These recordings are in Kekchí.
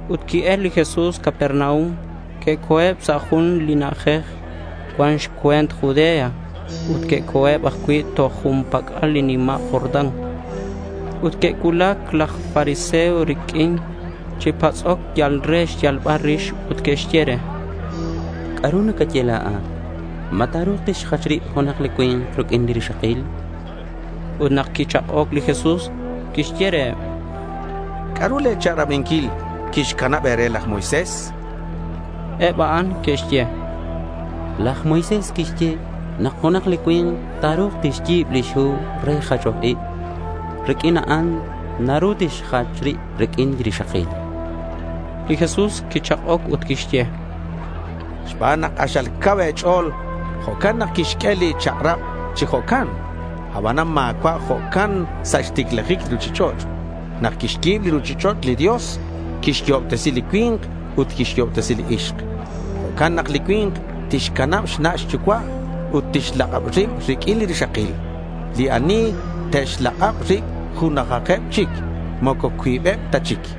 Ut qui-el li Jesús Capernaum. Que'co̱eb sa' jun li na'ajej cuan xcue̱nt Judea ut que'co̱eb ajcui' toj jun pac'al li nima' Jordán. Ut que'cuulac laj fariseo riq'uin chi patz'oc yal re xyalbal rix ut que'xye re: —¿C'a'ru nacaye la̱at? ¿Ma ta̱ru̱k tixjach rib junak cui̱nk riq'uin li rixakil? chanqueb re. Ut nak quichak'oc li Jesús, quixye reheb: —¿C'a'ru le̱ chak'rabinquil quixcanab e̱re laj Moisés?— Eb a'an que'xye: —Laj Moisés quixye nak junak li cui̱nk ta̱ru̱k tixyi̱b lix hu re jachoc ib ut riq'uin a'an naru tixjach rib riq'uin li rixakil.— Li Jesús quichak'oc ut quixye: —Xban nak k'axal cau e̱ch'o̱l, jo'can nak quixq'ue li chak'rab chi jo'can. Abanan ma̱cua' jo'can sa' xticlajic li ruchich'och'. Nak quixyi̱b li ruchich'och' li Dios, quixyo'obtesi li cui̱nk ut quixyo'obtesi li ixk. Jo'can nak li cui̱nk tixcanab xna' xyucua' ut tixlak'ab rib riq'uin li rixakil. Li ani te'xlak'ab rib junajeb chic. Moco cuibeb ta chic.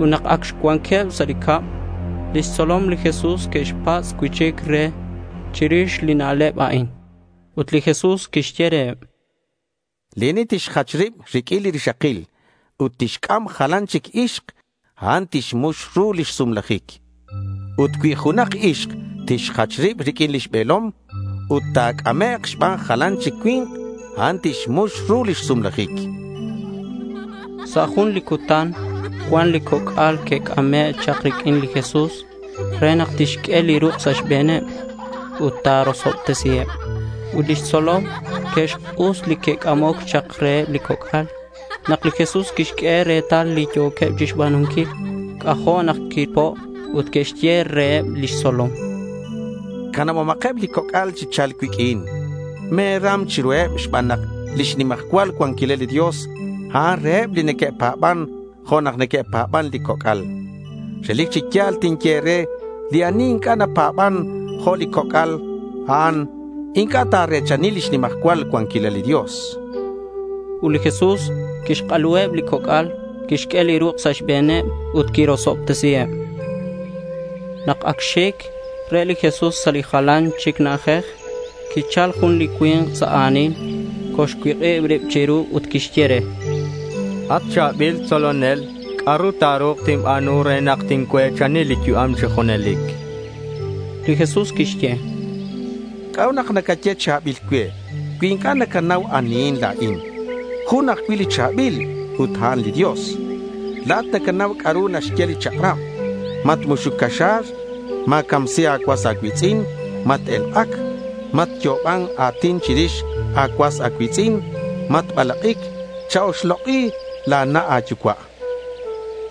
Ut nak ac cuanqueb sa' cab, lix tzolom li Jesús que'xpatz' cui'chic re chirix li na'leb a'in. Ut li Jesús quixye reheb: —Li ani tixjach rib riq'uin li rixakil ut tixc'am jalan chic ixk, a'an tixmux ru lix sumlajic. Ut cui junak ixk tixjach rib riq'uin lix be̱lom, ut ta̱c'amek' xban jalan chic cui̱nk, a'an tixmux ru lix sumlajic.— Sa' jun li cutan cuan li coc'al que'c'ame' chak riq'uin li Jesús re nak tixq'ue li ruk' sa' xbe̱neb ut ta̱rosobtesiheb. Ut lix tzolom que'xk'us li que'c'amoc chak reheb li coc'al. Nak li Jesús quixq'ue retal li yo̱queb chixba̱nunquil, c'ajo' nak quipo' ut quixye reheb lix tzolom: —Canabomakeb li coc'al chi cha̱lc cuiq'uin. Me̱ram chiruheb xban nak lix nimajcual cuanquilal li Dios, a'an reheb li neque'pa̱ban jo' nak neque'pa̱ban li coc'al. Relic chi ya̱l tinye e̱re li ani inc'a' napa̱ban jo' li coc'al, a'an inc'a' ta̱re̱chani lix nimajcual cuanquilal li Dios, chan. Ut li Jesús quixk'aluheb li coc'al, quixq'ue li ruk' sa' xbe̱neb, ut quirosobtesiheb. Nak ac xic re li Jesús sa' jalan chic na'ajej, quichal jun li cui̱nk sa' a̱nil, colxcuik'ib rib chiru ut quixye re: —At cha̱bil tzolonel, ¿c'a'ru ta̱ru̱k tinba̱nu re nak tincue̱chani li yu'am chi junelic?— Li Jesús quixye: —¿C'a'ut nak nacaye cha̱bil cue cui inc'a' nacanau anihin la̱in? Jun ajcui' li cha̱bil ut a'an li Dios. La̱at nacanau c'a'ru naxye li chak'rab: Matmuxuc caxa̱r. Ma̱camsi a̱cuas a̱cui̱tz'in. Mat-elk'ac. Matyo'oban a̱tin chirix a̱cuas a̱cui̱tz'in. Matbalak'ic. Cha-oxlok'i la̱ na' a̱yucua'.—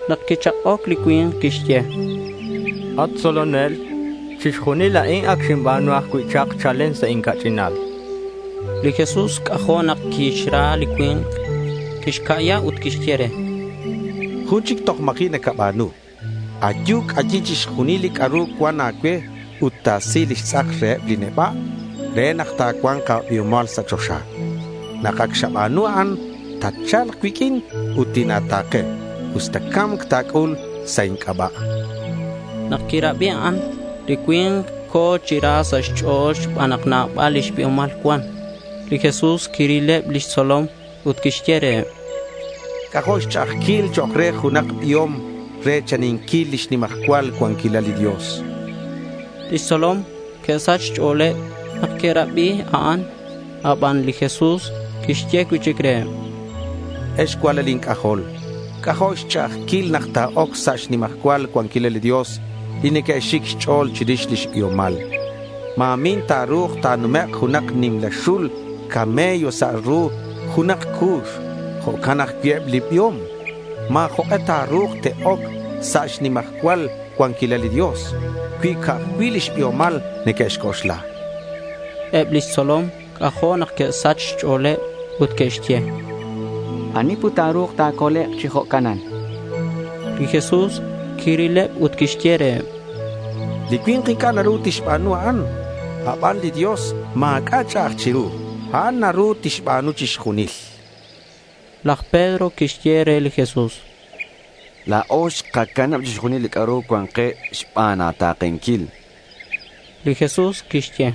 Nak quichak'oc li cui̱nk quixye: —At tzolonel, chixjunil a'in ac xinba̱nu ajcui' chak chalen sa' inca'ch'inal.— Li Jesús c'ajo' nak quixra li cui̱nk. Quixca'ya ut quixye re: —Jun chic toj ma̱ji' nacaba̱nu. Ayu, c'ayi chixjunil li c'a'ru cuan a̱cue ut ta̱si lix tz'ak reheb li neba' re nak ta̱cua̱nk a̱biomal sa' choxa. Nak ac xaba̱nu a'an, tatcha̱lk cuiq'uin ut tina̱ta̱ke usta ca̱mc ta̱c'ul sa' inc'aba', chan. Nak quirabi a'an, li cui̱nk co̱ chi ra sa' xch'o̱l xban nak nabal lix biomal cuan. Li Jesús quirileb lix tzolom ut quixye reheb: —C'ajo' xch'a'ajquil chok' re junak biom re̱chaninquil lix nimajcual cuanquilal li Dios.— Lix tzolom que'sach xch'o̱leb nak que'rabi a'an. Aban li Jesús quixye cui'chic reheb: —Ex cualal inc'ajol, c'ajo' xch'a'ajquil nak te'oc sa' xnimajcual cuanquilal li Dios li neque'xic xch'o̱l chirix lix biomal. Ma̱min ta̱ru̱k ta̱numek' junak nimla xul camello sa' ru junak cu̱x. Jo'can ajcui' eb li biom. Ma̱ jok'e ta̱ru̱k te'oc sa' xnimajcual cuanquilal li Dios cui ca'aj cui' lix biomal neque'xc'oxla.— Eb lix tzolom c'ajo' nak que'sach xch'o̱leb ut que'xye: —¿Ani put ta̱ru̱k ta̱colek' chi jo'canan?— Li Jesús quirileb ut quixye reheb: —Li cui̱nk inc'a' naru tixba̱nu a'an, aban li Dios ma̱c'a' ch'a'aj chiru. A'an naru tixba̱nu chixjunil.— Laj Pedro quixye re li Jesús: —La̱o xkacanab chixjunil li c'a'ru cuan ke xban a̱ta̱kenquil.— Li Jesús quixye: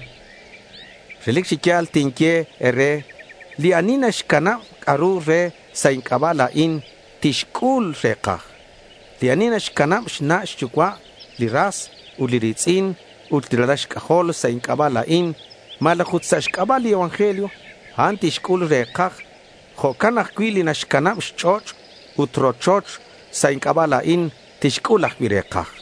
—Relic chi ya̱l tinye e̱re, li ani naxcanab c'a'ru re sa' inc'aba' la̱in, tixc'ul re̱kaj. Li ani naxcanab xna' xyucua', li ras ut li ri̱tz'in ut li ralal xc'ajol sa' inc'aba' la̱in malaj ut sa' xc'aba' li evangelio, a'an tixc'ul re̱kaj. Jo'can ajcui' li naxcanab xch'och' ut li rochoch sa' inc'aba' la̱in, tixc'ul ajcui' re̱kaj.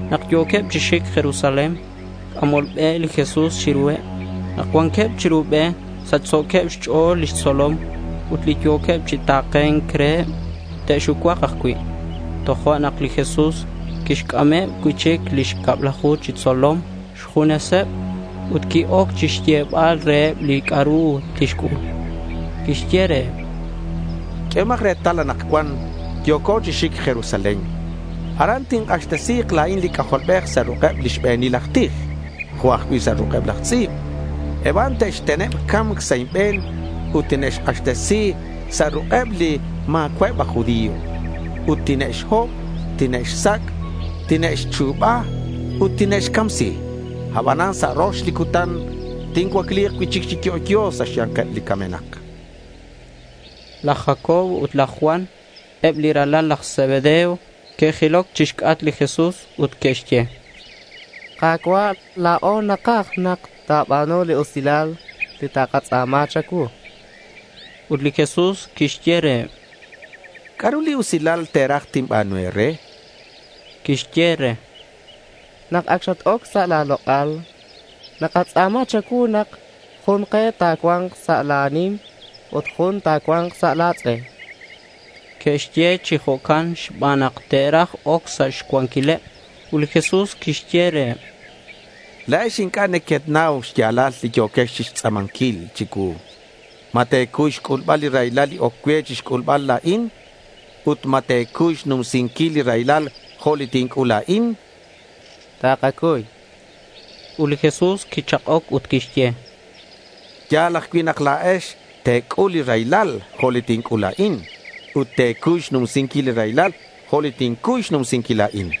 Nak yo̱queb chi xic Jerusalén c'amol be li Jesús chiruheb. Nak cuanqueb chiru be sachso̱queb xch'o̱l lix tzolom ut li yo̱queb chi ta̱ke̱nc reheb te'xucuak ajcui'. Tojo'nak li Jesús quixc'ameb cui'chic lix cablaju chi tzolom xjuneseb ut qui-oc chixyebal reheb li c'a'ru tixc'ul. Quixye reheb: —Q'uehomak retal. Anakcuan yo̱co chi xic Jerusalén. Aran tink'axtesi̱k la̱in li C'ajolbej sa' ruk'eb lix be̱nil aj tij jo' ajcui' sa' ruk'eb laj tz'i̱b. Eb a'an te'xteneb ca̱mc sa' inbe̱n ut tine'xk'axtesi sa' ruk'eb li ma̱cua'eb aj judío. Ut tine'xhob, tine'xsac', tine'xchu̱ba ut tine'xcamsi. Aban sa' rox li cutan tincuacli̱k cui'chic chi yo'yo sa' xya̱nkeb li camenak.— Laj Jacobo ut laj Juan, eb li ralal laj Zebedeo, que'jiloc chixc'atk li Jesús ut que'xye re: —Ka̱cua', la̱o nakaj nak ta̱ba̱nu li usilal li takatz'a̱ma cha̱cuu.— Ut li Jesús quixye reheb: —¿C'a'ru li usilal te̱raj tinba̱nu e̱re? chan reheb. Que'xye re: —Nak ac xat-oc sa' la̱ lok'al, nakatz'a̱ma cha̱cuu nak jun ke ta̱cua̱nk sa' la̱ nim ut jun ta̱cua̱nk sa' la̱ tz'e.— Que'xye chi jo'can xban nak te'raj oc sa' xcuanquileb. Ut li Jesús quixye reheb: —La̱ex inc'a' nequenau xya̱lal li yo̱quex chixtz'a̱manquil chicuu. ¿Ma te̱cuy xc'ulbal li raylal li oc cue chixc'ulbal la̱in? Ut, ¿ma te̱cuy xnumsinquil li raylal jo' li tinc'ul la̱in?— —¡Takacuy! chanqueb. Ut li Jesús quichak'oc ut quixye: —Ya̱l ajcui' nak la̱ex te̱c'ul li raylal jo' li tinc'ul la̱in. Ut te̱cuy xnumsinquil li raylal jo' li tincuy xnumsinquil la̱in.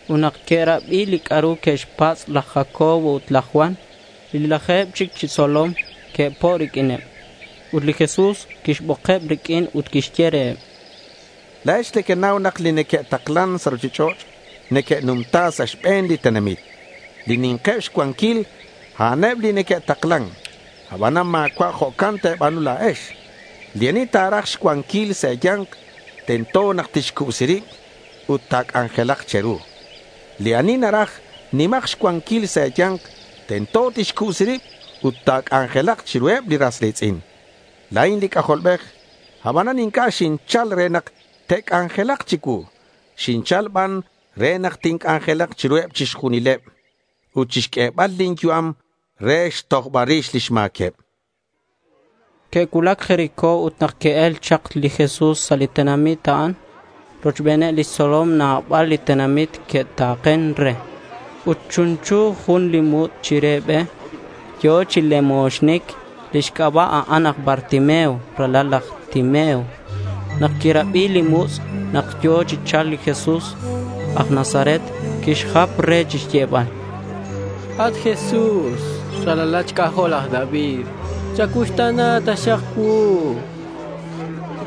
Ut nak que'rabi li c'a'ru que'xpatz' laj Jacobo ut laj Juan, li laje̱b chic lix tzolom que'po' riq'uineb. Ut li Jesús quixbokeb riq'uin ut quixye reheb: —La̱ex nequenau nak li neque'taklan sa' ruchich'och' neque'numta sa' xbe̱n li tenamit. Li ni̱nkeb xcuanquil, a'aneb li neque'taklan. Abanan ma̱cua' jo'can te̱ba̱nu la̱ex. Li ani naraj xcuanquil sa' e̱ya̱nk, tento nak tixcubsi rib ut ta̱c'anjelak che̱ru. Li ani naraj nima̱k xcuanquil sa' e̱ya̱nk, tento tixcubsi rib ut ta̱c'anjelak chiruheb li ras ri̱tz'in. La̱in li C'ajolbej. Abanan inc'a' xinchal re nak te'c'anjelak chicuu. Xinchal ban re nak tinc'anjelak chiruheb chixjunileb ut chixq'uebal lin yu'am re xtojbal rix lix ma̱queb, chan li Jesús reheb. Que'cuulac Jericó ut nak qui-el chak li Jesús sa' li tenamit a'an rochbeneb lix tzolom nabal li tenamit que'ta̱ken re. Ut chunchu jun li mutz' chire be. Yo̱ chi lemoxnic. Lix xc'aba', a'an aj Bartimeo, ralal laj Timeo. Nak quirabi li mutz' nak yo̱ chi cha̱lc li Jesús aj Nazaret, quixjap re chixyebal: —¡At Jesús, ralalat xc'ajol laj David, chacuuxta̱na taxak cuu! chan.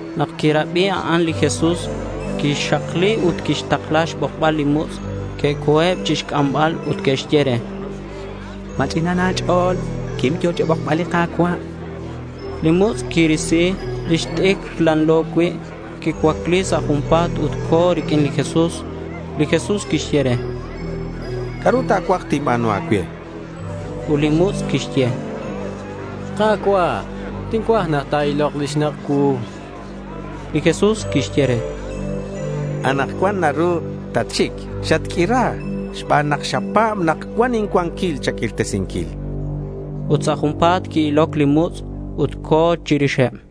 Nak quirabi a'an li Jesús quixakli ut quixtakla xbokbal li mutz'. Que'co̱eb chixc'ambal ut que'xye re: —Ma̱ch'ina a̱ch'o̱l. Quim. Yo̱ cha̱bokbal li Ka̱cua'.— Li mutz' quirisi lix t'icr lanlo cui'. Quicuacli sa' junpa̱t ut co̱ riq'uin li Jesús. Li Jesús quixye re: —¿C'a'ru ta̱cuaj tinba̱nu a̱cue?— Ut li mutz' quixye: —Ka̱cua', tincuaj nak ta̱ilok li xnak' cuu.— Li Jesús quixye re: —Anakcuan naru tatxic. Xatq'uira xban nak xapa̱b nak cuan incuanquil cha̱q'uirtesinquil, chan re. Ut sa' junpa̱t qui-iloc li mutz' ut co̱ chirixeb.